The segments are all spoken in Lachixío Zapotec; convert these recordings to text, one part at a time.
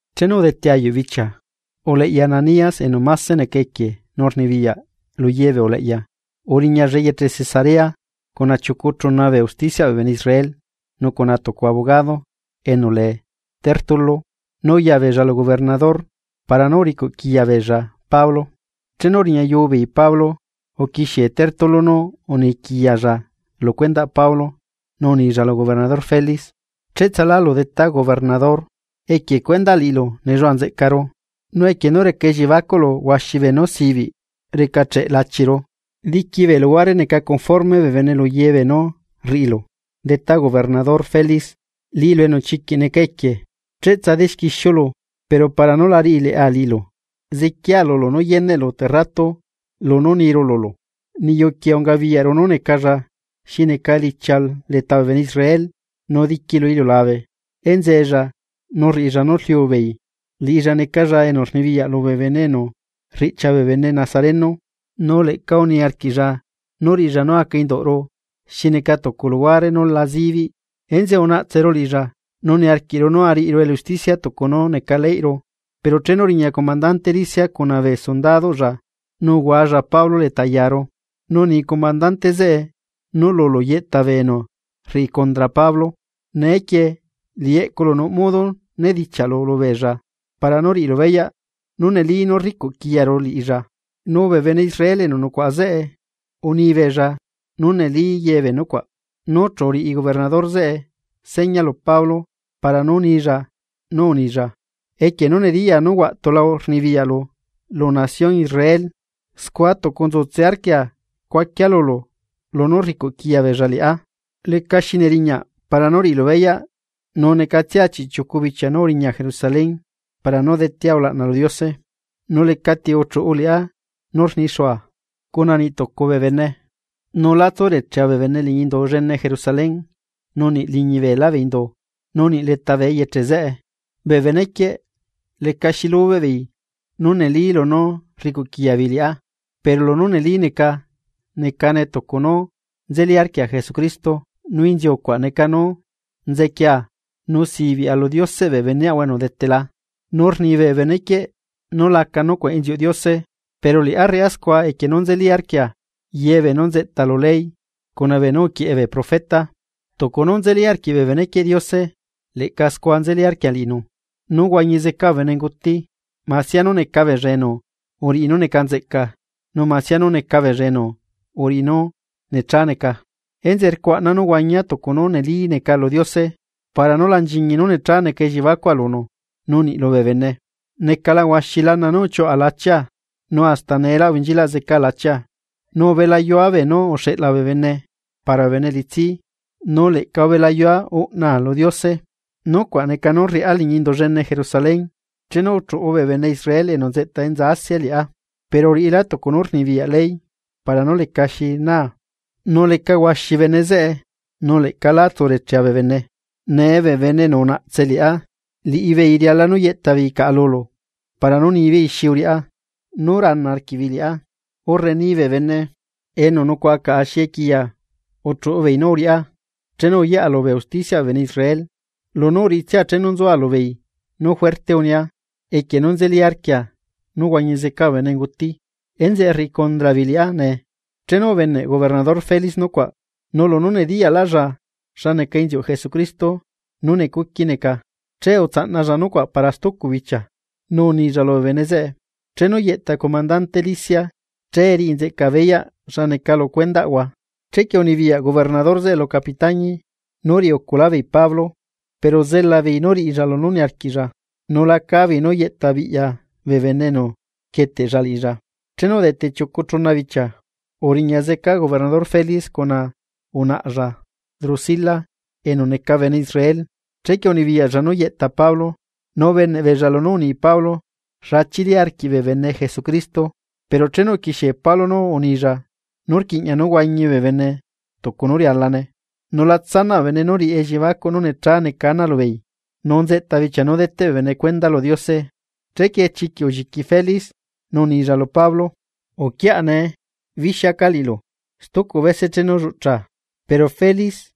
Chenu udete ayuꞌ bichia, uleꞌya Ananías enu máse neca equie nu rnibiyaꞌ lu ye bee uleꞌya, uriñalla eyeche Cesarea cuna chiucu chuna bee usticiaꞌ bee bene Israel nu cuna tucu abogado enu lee Tértulo. Nu uyabeella lu gobernador para nú uricuꞌquiꞌya beella Pablo. Chenu uriñayu beei Pablo, uquixie Tértulo nu uniquiyalla lu cuendaꞌ Pablo nu unilla lu gobernador Félix: ―Cheꞌtsalu detá gobernador, equie cuendaꞌ liꞌilu nelluaꞌa nzeꞌcaru, nu equie nú reca elliebacuꞌlu huaxi beenú sibiꞌ recacheꞌ lachiru. Diqui bee luhuare neca conforme bee bene lu ye beenú rriꞌilu detá gobernador Felix, liꞌilu enu chiquiꞌ neca equie, cheꞌtsa dexquixiulu. Pero para nú la riꞌi leꞌa liꞌilu, ziquia lulu nú yeneꞌlu tucu rratu lunú niru lulu. Niyu quieꞌ ungabiyaꞌru nú necalla xi neca elichia leta bee bene Israel, nu diqui lu iliulabe enzeella nu rriꞌilla nú rliu bee bene, liꞌilla necalla enu rnibiyaꞌ lubee bene enu rriꞌchia bee bene Nazareno. Nu leꞌca uniarquiꞌlla nú riꞌilla nú aca induꞌru xi neca tucu luhuare nú la zibiꞌ, enzeꞌe unaꞌtseru liꞌilla nu niarquiꞌru nú ariꞌiru elusticia tucu nú neca leyꞌru. Pero chenu uriña comandante Lisias cuna bee sundadoꞌlla nu uhuaxuꞌulla Pablo leta yaru. Nu uni comandante zeꞌe nú lulu yeꞌta bee enu rriꞌi condra Pablo, neequie liꞌi eꞌculu nuꞌ modo nedichiaꞌlu lubeella para nú riꞌilu beyaꞌ nú neli nú rricuꞌ quiyaru liꞌilla. Nu bee bene Israel enu nucuaꞌa zeꞌe unibeella nú neli ye bee nucuaꞌ. Nu chu uriꞌi gobernador zeꞌe seña lu Pablo para nú nilla, nu unilla: ―Equie nú nediyaa nú huaꞌtula rnibiyaꞌlu lu nación Israel scua tucu nzutse arquia cuaquia lulu lunú rricuꞌquiya beella liꞌá. Lecaxi neriñaꞌ para nú riꞌilu beyaꞌ nu necatsia chiꞌchiucu bichia nú uriña Jerusalén, para nú detea ulaꞌna lu Diose. Nu lecati uchuꞌu liꞌá nú rnixua cuna niꞌ tucu bee bene, nu la tsurechea bee bene liñi Indu llene Jerusalén, nu niꞌ liñi beelá bee indu, nu niꞌ leta eyeche zeꞌe. Bee benequieꞌ lecaxi lubeꞌ beei nú neli lunú rricuꞌquiya beei liꞌá. Pero lunú neli neca, necane tucu nú nzeli arquia Jesucristo nu inziucuaꞌ neca nú nzequia nu sibiꞌa lu Dioseꞌ bee beneꞌahua enu udetela, nu rni bee benequieꞌ nú laca nucuaꞌ inziuꞌ Diose, pero liꞌá rriꞌá scua equie nú nzeli arquia ye beenú nzeꞌta lu ley cuna beenú uquieꞌe bee profeta. Tucu nú nzeli arquiꞌ bee benequieꞌ Diose leꞌca scua nzeli arquia liꞌinu, nú huañi zeca bee benenguti, masia nú neca beella enu uriꞌi nú necanzeꞌca nu masia nú neca beella enu uriꞌi nú necha neca. Enzeꞌe rcuaꞌna nú huañia tucu nú neli neca lu Diose para nú la nchiñi nú necha neca elliebacua lunu, nu niꞌ lubee bene. ’Necala huaxi lana nú uchiuꞌa lachia, nu hasta neelá ubenchilaꞌ zeca lachia, nu ubelayua beenú uxeꞌla bee bene para bee bene elitsi, nu leꞌca ubelayua uꞌna lu Diose. Nucuaꞌ neca nú rriꞌá liñi Indu llene Jerusalén chenu uchuꞌu bee bene Israel enu nzeꞌta enza Asia liꞌá, pero uriꞌilá tucu nú rnibiyaꞌ ley para nú lecaxi naa. Nu leca huaxi bene zeꞌe nu leꞌca lá tsurechea bee bene. Nee bee bene enu unaꞌtse liꞌá, liꞌibeei riala nú yeꞌta beei caꞌa lulu para nú nibeei xi uriꞌá nú rana arquiꞌbeei liꞌá. Urre ni bee bene enu nucuaꞌa caꞌa xi equiya uchuꞌu beei nú uriꞌá chenu uyaꞌa lubee usticiaꞌ bee bene Israel. Lunú uriꞌitsia chenu nzua lubeei nú juerte unia: “Equie nú nzeli arquia nú huañi zeca bee benenguti. Enzeꞌe rriꞌi condra beei liꞌá nee.” Chenu ubeneꞌ gobernador Felix nucuaꞌ, nu lunú nediyaꞌlaꞌlla xa neca inziuꞌ Jesucristo nú necuqui neca, che utsaꞌnalla nucuaꞌ para stucu bichia nu unilla lubee bene zeꞌe: ―Chenu yeꞌta comandante Lisias, che riꞌi nzeꞌcaa beyaꞌ xa neca lu cuendaꞌhua. Chequie unibiyaꞌ gobernador zeꞌe lu capitañi nú riꞌi uculá beei Pablo, pero zelabeei nú riꞌilla lunú niarquiꞌlla nu la cábeei nú yeꞌtabiꞌya bee bene enu rquieteꞌlla liꞌilla. Chenu udete chiucu chuna bichia, uriña zeca gobernador Felix cuna unaꞌalla Drusila enu neca bene Israel. Chequie unibiyaꞌlla nú yeꞌta Pablo, nu ubeneꞌbeella lunú uni Pablo xa chili arquiꞌ bee bene Jesucristo. Pero chenu uquixie Pablo nú unilla nú rquiꞌña nú huañi bee bene tucu nú rialane, nu la tsanaꞌ bee bene nú riꞌi elliebacuꞌ nú necha neca ana lubeei, nu nzeꞌta bichia nú deteꞌ bee bene cuenda lu Diose, chequie chiquiꞌ ulliqui Félix nu unilla lu Pablo: ―Uquiaꞌa. Bixiaca liꞌilu stucu bese chenu lluꞌchaa. Pero Félix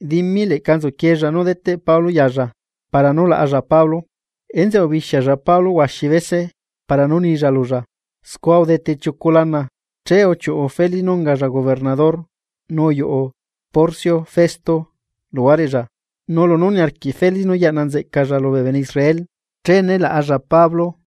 dimi leꞌca nzuquieella nú deteꞌ Pablo yalla para nú laꞌalla Pablo, enzeꞌe ubixialla Pablo huaxi bese para nú nilla lulla. Scua udete chiucu lana, che uchiuꞌu Félix nú ungalla gobernador nu uyuꞌu Porcio Festo luhuareꞌlla. Nu lunú niarquiꞌ Félix nú yaꞌna nzeꞌcalla lubee bene Israel, che nélaꞌalla Pablo.